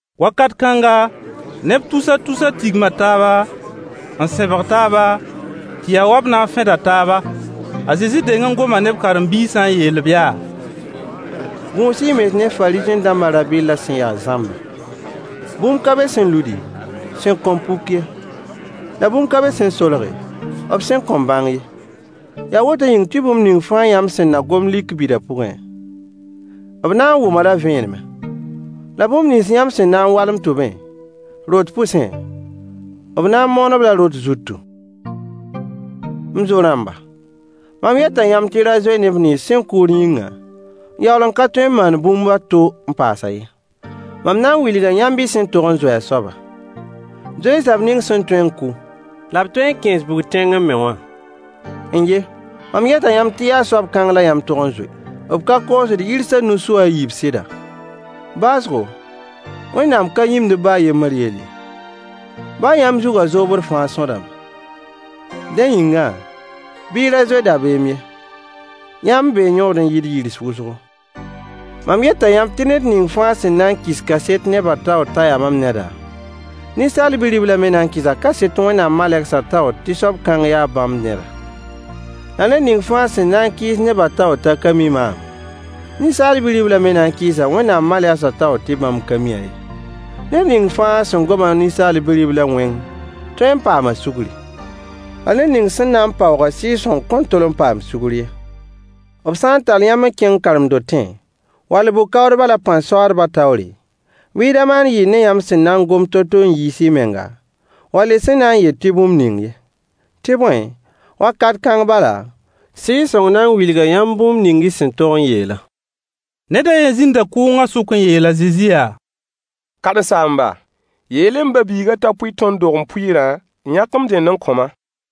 Wakat kãnga, neb tus tus tigma taaba, n sẽbg taaba, tɩ ya wa b na n fẽda taaba. A Zezi deng n goma ne b karen-biisã n yeel-b yaa: Gũus-y y mens ne Fariisẽ-dãmbã rã-bɩllã sẽn ya zãmbã. Bũmb ka be sẽn ludi, sẽn kõn puk ye. La bũmb ka be sẽn solge, b sẽn kõn bãng ye. Yaa woto yĩng tɩ bũmb ning fãa yãmb sẽn na gom lik bida pʋgẽ, b na n wʋm-a-la vẽenemẽ. La bũmb nins yãmb sẽn na n walem tʋbẽ, rot pʋsẽ, b na n moon-b-la rot zutu. M zo-rãmba, mam yeta yãmb tɩ y ra zoe neb nins sẽn kʋʋd yĩngã n yaool n ka tõe n maan bũmb a to n paasã ye. Mam na n wilga yãmb y sẽn tog n zoe a soaba. Zoe-y soab ning sẽn tõe n kʋ, la b tõe n kẽes bug-tẽngẽ me wã. N-ye! Mam yeta yãmb tɩ yaa soab kãng la yãmb tog n zoe. B ka koosd yirs a nu su a yiib sɩda? Baoosgo, Wẽnnaam ka yĩmd b baa a yembr yell ye. Baa yãmb zugã zoobd fãa sõdame. Dẽ yĩngã, bɩ y ra zoe rabeem ye. Yãmb bee yõod n yɩɩd yirs wʋsgo. Mam yeta yãmb tɩ ned ning fãa sẽn na n kɩs kaset nebã taoor t'a yaa mam neda, Ninsaal Bi-riblã me na n kɩsa kaset Wẽnnaam malegsã taoor tɩ soab kãng yaa bãmb neda. La ned ning fãa sẽn na n kɩɩs nebã taoor t'a ka mi maam, Ninsaal Bi-riblã me na n kɩɩsa Wẽnnaam malegsã taoor tɩ bãmb ka mi-a ye. Ned ning fãa sẽn goma Ninsaal Bi-riblã wẽng tõe n paama sugri. La ned ning sẽn na n paoog-a Sɩɩg-sõng kõn tol n paam sugr ye. B sã n tall yãmb n kẽng karen-dotẽ wall bʋ-kaoodba la pãn-soaadbã taoore, bɩ y da maan yɩɩr ne yãmb sẽn na n gom to-to n yiis y menga, wall y sẽn na n yet tɩ bũmb ning ye. Tɩ bõe, wakat kãng bala, Sɩɩg-sõng na n wilga yãmb bũmb ning y sẽn tog n yeelã. Ned a yen zĩnda kʋʋngã sʋk n yeel a Zezi yaa: Karen-saamba, yeel-y m ba-biigã t'a pʋɩ tõnd dogem pʋɩɩrã n yãk m dẽnd n kõ-ma.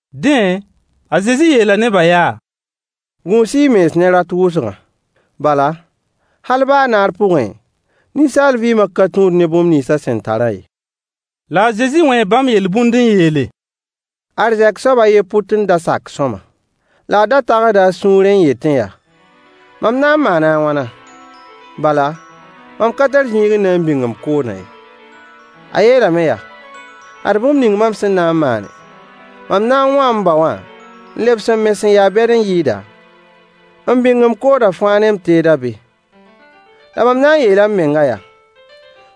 Dẽ, a Zezi yeela nebã yaa: Gũus-y y mens ne rat wʋsgã. Bala, hal baa naar pʋgẽ, ninsaal vɩɩmã ka tũud ne bũmb nins a sẽn tarã ye. La a Zezi wẽe bãmb yel-bũnd n yeele: Arzɛk soab a yen pʋt n da sak sõama. La a da tagsda a sũurẽ n yetẽ yaa: Mam na n maana a wãna? Bala, mam ka tar zĩig n na n bĩng m koodã ye. A yeelame yaa: “Ad bũmb ning mam sẽn na n maane: Mam na n wãa m bao wã n lebs n me sẽn ya bɛd n yɩɩda, n bĩng m koodã fãa ne m teedã be. La mam a n yeela m meng yaa: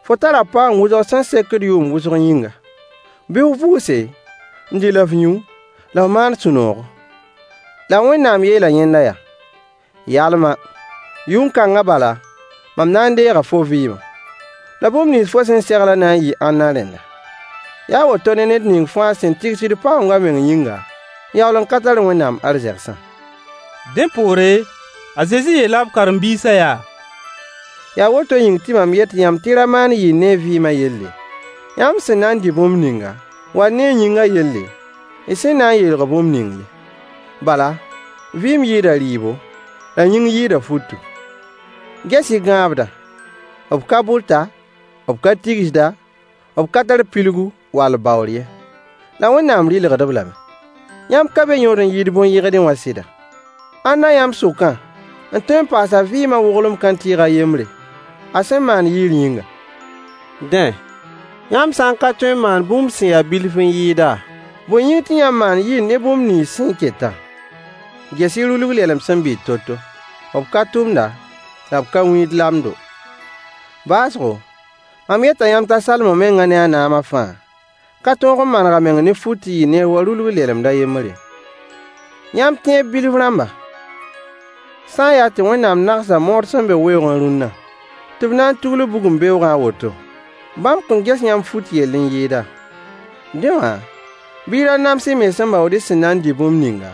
Fo tara paoong wʋsg sẽn sekd yʋʋm wʋsg yĩnga. Bɩ f vʋʋse, n dɩ la f yũ, la f maan sũ-noogo.” La Wẽnnaam yeela yẽnda yaa: “Yalma! Yʋn-kãngã bala, mam na n deega fo vɩɩmã. La bũmb nins fo sẽn seglã na n yɩɩ ãnna rẽnda?” Yaa a woto ne ned ning fãa sẽn tigsd paoong a meng yĩnga, n yaool n ka tar Wẽnnaam arzegsã. Dẽ poore, a Zezi yeela b karen-biisã yaa: Yaa woto yĩng tɩ mam yet yãmb tɩ y ra maan yɩɩr ne y vɩɩmã yelle, yãmb sẽn na n dɩ bũmb ninga, wall ne y yĩngã yelle, y sẽn na n yeelg bũmb ning ye. Bala, vɩɩm yɩɩda rɩɩbo, la yĩng yɩɩda futu. Ges-y gãabdã! B ka bʋta, b ka tigsda, b ka tar pilgu wall baoor ye. La Wẽnnaam rɩlgd-b lame. Yãmb ka be yõod n yɩɩd bõn-yɩgdɩ wã sɩda? Ãnna yãmb sʋkã n tõe n paas a vɩɩmã woglem kãntɩɩg a yembre, a sẽn maand yɩɩr yĩnga? Dẽ, yãmb sã n ka tõe n maan bũmb sẽn ya bilf n yɩɩda, bõe yĩng tɩ yãmb maand yɩɩr ne bũmb nins sẽn ketã? Ges-y rulg-lɛlem sẽn bɩt to-to. B ka tʋmda, la b ka wĩid lamdo. Baoosgo, mam yeta yãmb t'a Salomo mengã ne a naamã fãa ka tõog n maneg a meng ne fut n yɩ neer wa rulg-lelemd a yembr ye. Yãmb tẽeb bilf rãmba, sã n yaa tɩ Wẽnnaam nagsa mood sẽn be weoogẽ rũnna, tɩ b na n tugl-b bugum beoogã a woto, bãmb kõn ges yãmb fut yell n yɩɩda? Dẽ wã, bɩ y da nams y mens n baood y sẽn na n dɩ bũmb ninga,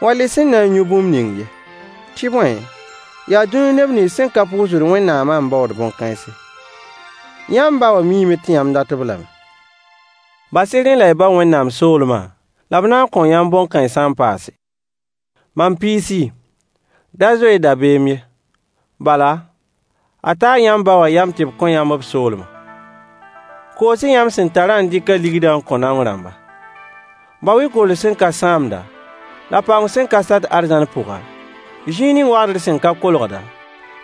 wall y sẽn na n yũ bũmb ning ye. Tɩ bõe, yaa dũni neb nins sẽn ka pʋʋsd Wẽnnaamã n baood bõn-kãense. Yãmb ba wã miime tɩ yãmb dat-b lame. Bas-y rẽ la y bao Wẽnnaam soolmã, la b na n kõo yãmb bõn-kãensã n paase. Mam piisi, da zoe-y dabeem ye. Bala, a taa yãmb ba wã yam tɩ b kõ yãmb b soolmã. Koos-y yãmb sẽn tarã n dɩk a ligdã n kõ naong rãmba. Bao-y kord sẽn ka sãamda, la paoong sẽn ka sat arzãn pʋga, zĩig ning wagdr sẽn ka kolgda,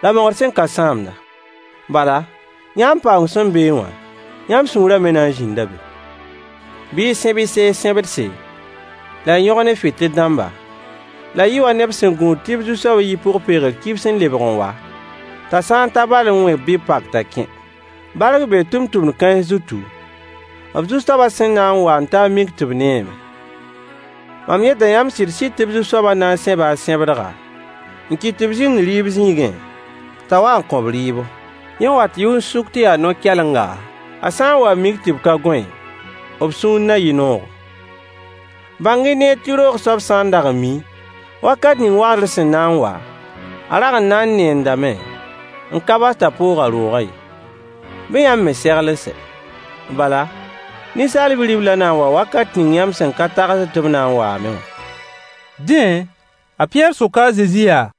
la mogd sẽn ka sãamda. Bala, yãmb paoong sẽn beẽ wã, yãmb sũurã me na n zĩnda be. Bɩ y sẽb y sees sẽbdse, la y yõgen y fɩtɩl-dãmba, la y yɩ wa neb sẽn gũud tɩ b zu-soab yi pʋg-peegr kibs n lebg n wa, t'a sã n ta bal n wẽ bɩ b pak t'a kẽ. Bark bee tʋmtʋmd kãens zutu, b zu-soabã sẽn na n wa n ta n mik tɩ b neeme. Mam yeta yãmb sɩd-sɩd tɩ b zu-soabã na n sẽba a sẽbdga, n kɩt tɩ b zĩnd rɩɩb zĩigẽ, t'a wa n kõ-b rɩɩbo. Yẽ wat yʋn-sʋk tɩ ya no-kɛlenga, a sã n wa n mik tɩ b ka gõe, b sũur na yɩ noogo. Bãng-y neer tɩ roog soab sã n dag n miẽ wakat ning wagdr sẽn na n wa, a rag n na n neendame n ka bas t'a poog a roogã ye. Bɩ yãmb me segl n sɛ. Bala, Ninsaal Bi-riblã na n waa wakat ning yãmb sẽn ka tagsd tɩ b na n waame wã. Dẽ, a Pɩyɛɛr soka a Zezi yaa: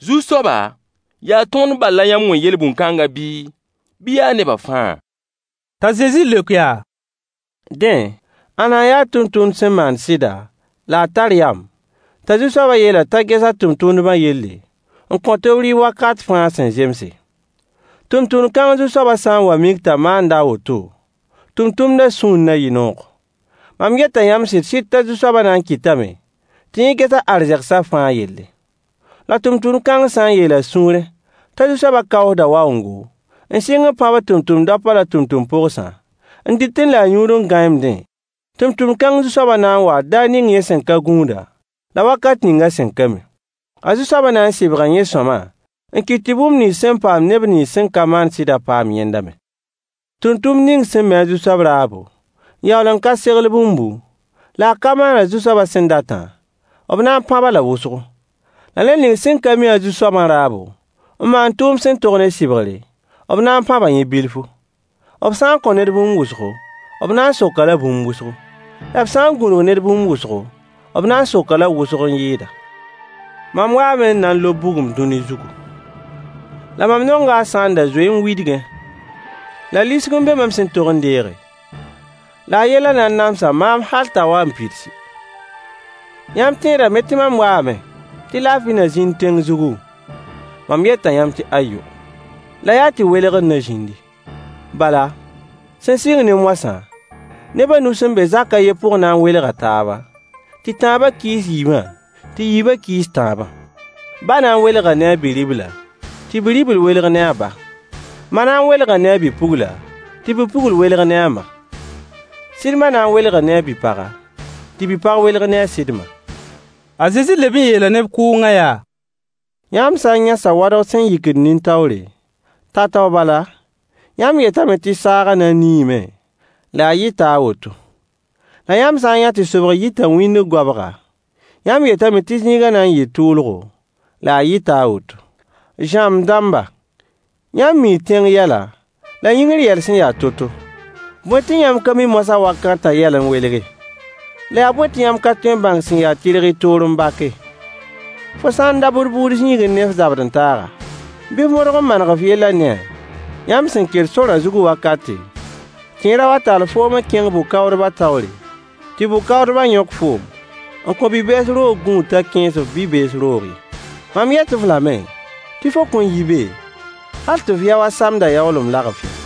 Zu-soaba, yaa tõnd bal la yãmb wẽ yel-bũn kãngã bii, bɩ yaa neba fãa? T'a Zezi leok yaa: Dẽ, ãnna n ya tʋmtʋmd sẽn maand sɩda la a tar yam, t'a zu-soabã yeel-a t'a ges a tʋmtʋmdbã yelle, n kõt-b rɩɩb wakat fãa sẽn zemse? Tʋmtʋmd kãng zu-soabã sã n wa n mik t'a maanda a woto, tʋmtʋmdã sũur na yɩ noogo. Mam yeta yãmb sɩd-sɩd t'a zu-soabã na n kɩtame tɩ yẽ ges a arzegsã fãa yelle. La tʋmtʋmd kãng sã n yeel a sũurẽ t'a zu-soabã kaoosda waoongo, n sɩng n pãbd tʋmtʋmd daopã la tʋmtʋmd pogsã, n dɩtẽ la a yũud n gãeemdẽ, tʋmtʋmd kãng zu-soabã na n waa daar ning yẽ sẽn ka gũud-a, la wakat ning a sẽn ka mi. A zu-soabã na n sɩbga yẽ sõama, n kɩt tɩ bũmb nins sẽn paamd neb nins sẽn ka maand sɩdã paam yẽnda me. Tʋmtʋmd ning sẽn mi a zu-soab raabo, n yaool n ka segl bũmbu, la a ka maan a zu-soabã sẽn datã, b na n pãb-a la wʋsgo. La ned ning sẽn ka mi a zu-soabã raabo, n maan tʋʋmd sẽn tog ne sɩbgre, b na n pãba yẽ bilfu. B sã n kõ ned bũmb wʋsgo, b na n sok-a-la bũmb wʋsgo. La b sã n gũnug ned bũmb wʋsgo, b na n sok-a-la wʋsg n yɩɩda. Mam waame n na n lob bugum dũni zugu. La mam nonga a sã n da zoe n widgẽ! La lisg n be mam sẽn tog n deege, la a yellã na n namsa maam hal t'a wa n pidsi. Yãmb tẽedame tɩ mam waame tɩ laafɩ na zĩnd tẽng zugu? Mam yeta yãmb tɩ ayo. La yaa tɩ welgr na zĩndi. Bala, sẽn sɩng ne moasã, neb a nu sẽn be zak a yen pʋg na n welga taaba, tɩ tãabã kɩɩs yiibã, tɩ yiibã kɩɩs tãabã. Ba na n welga ne a bi-ribla, tɩ bi-ribl welg ne a ba. Ma na n welga ne a bi-pugla, tɩ bi-pugl welg ne a ma. Sɩd ma na n welga ne a bi-paga, tɩ bi-pag welg ne a sɩd ma. A Zezi leb n yeela neb kʋʋngã yaa: Yãmb sã n yã sawadg sẽn yikd nin-taoore, tao-tao bala, yãmb yetame tɩ saagã na n niime, la a yɩta a woto. La yãmb sã n yã tɩ sobg yita wĩndg goabga, yãmb yetame tɩ zĩigã na n yɩɩ tʋʋlgo, la a yɩta a woto. Zãmb-dãmba, yãmb mii tẽng yɛla, la yĩngr yɛl sẽn ya to-to. Bõe tɩ yãmb ka mi moasã wakatã yɛl n welge? La yaa bõe tɩ yãmb ka tõe n bãng sẽn ya tɩrg y toor n bake? Fo sã n dabd bʋʋd zĩigẽ ne f zabd-n-taaga, bɩ f modg n maneg f yellã ne-a, yãmb sẽn ket sorã zug wakate, tɩ yẽ ra wa tall foom n kẽng bʋ-kaoodba taoore, tɩ bʋ-kaoodbã yõk foom n kõ bi-bees roog gũud t'a kẽes-f bi-bees roog ye. Mam yet-f lame tɩ fo kõn yi be hal tɩ f yao a samdã yaoolem lagf ye.